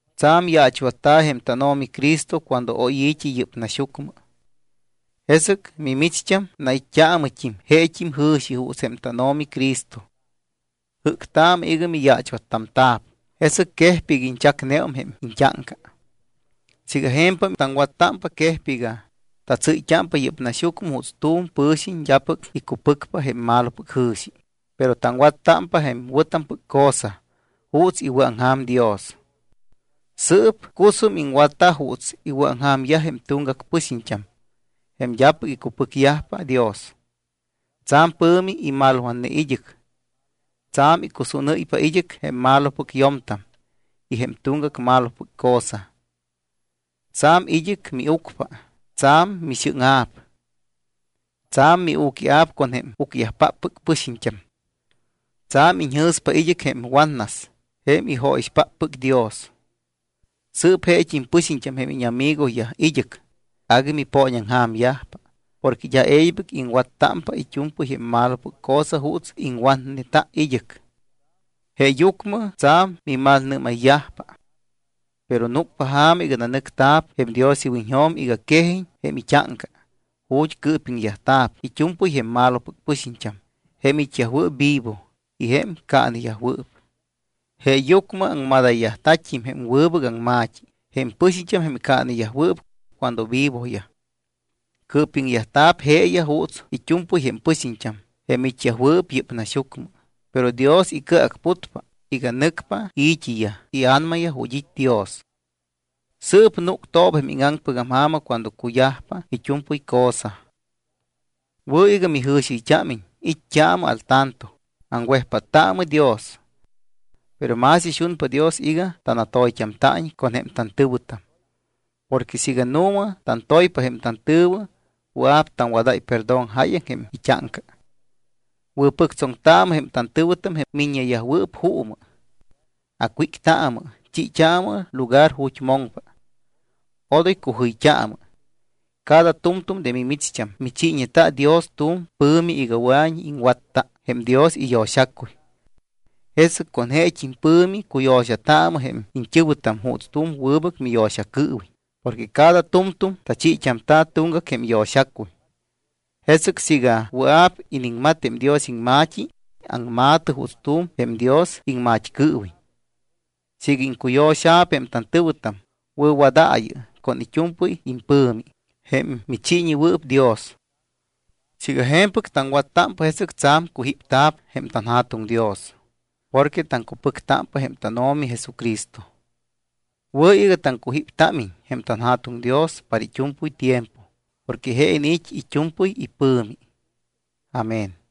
Tsa̱m yaachwatta̱ jém tánO̱mi Cristo cuando oy i̱t́i yɨ́p naxyucmɨ. Jesɨc mimicht́am nait́t́aamɨt́im jeet́im jɨ̱xi juuts jém tánO̱mi Cristo. Jɨ́ctaamɨ iga miyaachwattamta̱p, jesɨc quejpa iga iñchacneum jém iñt́áŋca. Siiga je̱mpam taŋwattámpa, quejpa iga tasɨɨtámpa yɨ́p naxyucmɨ juuts tu̱m pɨ̱xiñ d́apɨc icupɨcpa jém malopɨc jɨ̱xi, pero taŋwattámpa jém wɨ̱tampɨc cosa juuts iwɨ̱aŋja̱m Dios. Sɨɨp cusum iŋwatta juuts iwɨ̱aŋja̱myaj jém tuŋgac pɨxiñt́am, jém d́apɨc icupɨcyajpa Dios. Tsa̱m pɨ̱mi immalwatne id́ɨc. Tsa̱m iŋcusúnɨ́ypa id́ɨc jém malopɨc yo̱mtam y jém tuŋgac malopɨc cosa. Tsa̱m id́ɨc miucpa, tsa̱m mixɨ́ŋa̱p. Tsa̱m miu̱quia̱p con jém ucyajpáppɨc pɨxiñt́am. Tsa̱m iñjɨ̱spa id́ɨc jém watnas jém ijóyixpáppɨc Dios. Sɨɨp jeet́im pɨxiñt́am jém íñamigoyaj id́ɨc, agui mipooñaŋja̱myajpa porque d́a e̱ybɨc iŋwattámpa it́u̱mpɨy jém malopɨc cosa juuts iŋwatneta id́ɨc. Jeeyucmɨ tsa̱m mimalnɨ́mayyajpa. Pero núcpa ja̱ma iga nanɨcyajta̱p jém Dios iwiñjo̱m iga quejiñ jém it́áŋca ju̱t́ cɨɨpiŋyajta̱p it́u̱mpɨy jém malopɨc pɨxiñt́am jém it́yajwɨɨp vivo y jém caaneyajwɨɨp. Jeeyucmɨ aŋmadayyajta̱t́im jém wɨbɨc aŋma̱t́i jém pɨxiñt́am jém caaneyajwɨɨp cuando vivoyaj. Cɨɨpiŋyajta̱p jeeyaj juuts it́u̱mpɨy jém pɨxiñt́am jém it́yajwɨɨp yɨ́p naxyucmɨ, pero Dios icɨacputpa iga nɨcpa i̱t́iyaj ia̱namayaj ju̱t́ it́ Dios. Sɨɨp núctooba jém íŋaŋpɨc ja̱ma cuando cuyajpa it́u̱mpɨy cosa. Wɨ̱ iga mijɨ̱xiɨyt́ámiñ, it́t́aamɨ al tanto, aŋwejpáttaamɨ Dios. Pero más ixunpa Dios iga tanatoyt́amta̱iñ con jém tantɨ̱wɨtam. Porque siiga nu̱ma tantoypa jém tantɨ̱wɨ, wɨa̱p taŋwadáy perdón jáyaŋ jém it́áŋca. Wɨ̱pɨctsoŋtaamɨ jém tantɨ̱wɨtam, jém miññeyajwɨɨp juumɨ. Acwíctaamɨ, chiit́aamɨ lugar ju̱t́ moŋpa. Odoy cujɨyt́aamɨ. Cada tu̱mtu̱m de mimicht́am michiiñeta Dios tu̱m pɨ̱mi iga wɨa̱iñ iŋwatta jém Dios iyo̱xacuy. Jesɨc con jeet́im pɨ̱mi cuyo̱xataamɨ jém iñt́ɨ̱wɨtam juuts tu̱m wɨbɨc miyo̱xacɨɨwiñ porque cada tu̱mtu̱m tachiit́amta̱ tuŋgac jém yo̱xacuy. Jesɨc siiga wɨa̱p iniŋmat jém Dios iŋma̱t́i, aŋma̱tɨ juuts tu̱m jém Dios iŋmat́cɨɨwiñ. Siiga iŋcuyo̱xa̱p jém tantɨ̱wɨtam, wɨ̱wadaayɨ con it́u̱mpɨy impɨ̱mi, jém michiiñewɨɨp Dios. Siiga je̱mpɨc taŋwattámpa, jesɨc tsa̱m cujípta̱p jém tanJa̱tuŋ Dios porque taŋcupɨctámpa jém tánO̱mi Jesucristo. Wɨ̱ iga taŋcujíptámiñ jém tanJa̱tuŋ Dios para it́u̱mpɨy tiempo porque je iniit́ it́u̱mpɨy ipɨ̱mi. Amén.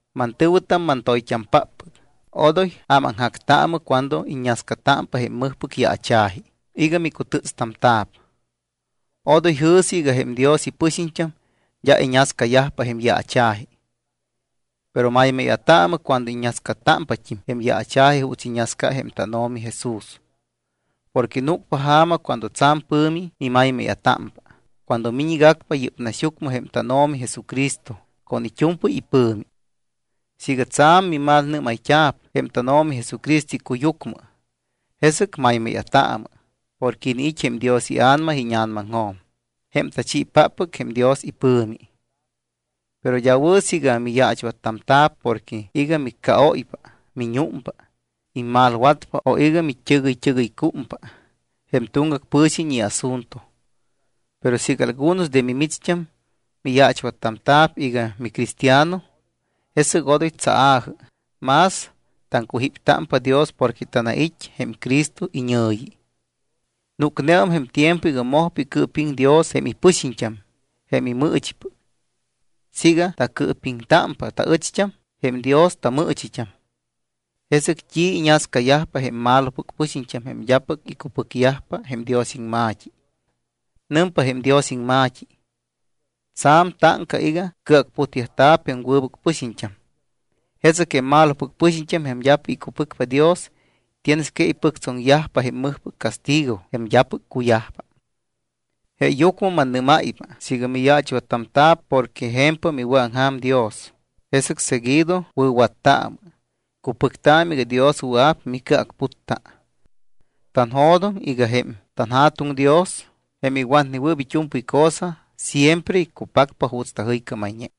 Mantɨ̱wɨtam mantoyt́ampáppɨc, odoy ámaŋjactaamɨ cuando iññascatámpa jém mɨjpɨc yaacha̱ji iga micutɨ́tstamta̱p. Odoy jɨ̱sɨ iga jém Dios ipɨxiñt́am d́a iñascayajpa jém yaacha̱ji. Pero maymáya̱taamɨ cuando iññascatámpat́im jém yaacha̱ji juuts iñascane jém tánO̱mi Jesús. Porque núcpa ja̱ma cuando tsa̱m pɨ̱mi mimaymáya̱támpa cuando miñgacpa yɨ́p naxyucmɨ jém tánO̱mi Jesucristo con it́u̱mpɨy ipɨ̱mi. Siiga tsa̱m mimalnɨ́mayt́a̱p jém tánO̱mi Jesucristo icuyucmɨ, jesɨc maymáya̱taamɨ porque iniit́ jém Dios iA̱nama íña̱namaŋjo̱m jém tachiipáppɨc jém Dios ipɨ̱mi. Pero d́a wɨ̱ siiga miyaachwattamta̱p porque iga miccaóypa, miñúmpa, immalwatpa o iga mit́ɨgɨyt́ɨgɨycúmpa jém tuŋgac pɨ̱xiñ iasunto. Pero siiga algunos de mimicht́am miyaachwattamta̱p iga micristiano, jesɨc odoy tsaa̱jɨ, mas taŋcujíptámpa Dios porque tanait́ jém Cristo iñɨ̱yi. Núcneum jém tiempo iga mojpa icɨɨpiŋ Dios jém ipɨxiñt́am jém imɨɨchipɨc. Siiga tacɨɨpiŋtámpa taɨcht́am, jém Dios tamɨɨchit́am, ¿jesɨc t́i iñascayajpa jém malopɨc pɨxiñt́am jém d́apɨc icupɨcyajpa jém Dios iŋma̱t́i? Nɨmpa jém Dios iŋma̱t́i: Tsa̱m táŋca iga cɨacputyajta̱p jém wɨbɨc pɨxiñt́am. Jesɨc jém malopɨc pɨxiñt́am jém d́apɨc icupɨcpa Dios tienes que ipɨctsoŋyajpa jém mɨjpɨc castigo jém d́apɨc cuyajpa. Jeeyucmɨ mannɨ́máypa siiga miyaachwattamta̱p porque je̱mpam iwɨ̱aŋja̱m Dios, jesɨc seguido wɨ̱wattaamɨ, cupɨctaamɨ iga Dios wɨa̱p micɨacputta. Tanjo̱doŋ iga jém tanJa̱tuŋ Dios, jém iwatnewɨɨp it́u̱mpɨy cosa, siempre iccupacpa juuts tajɨycámayñe.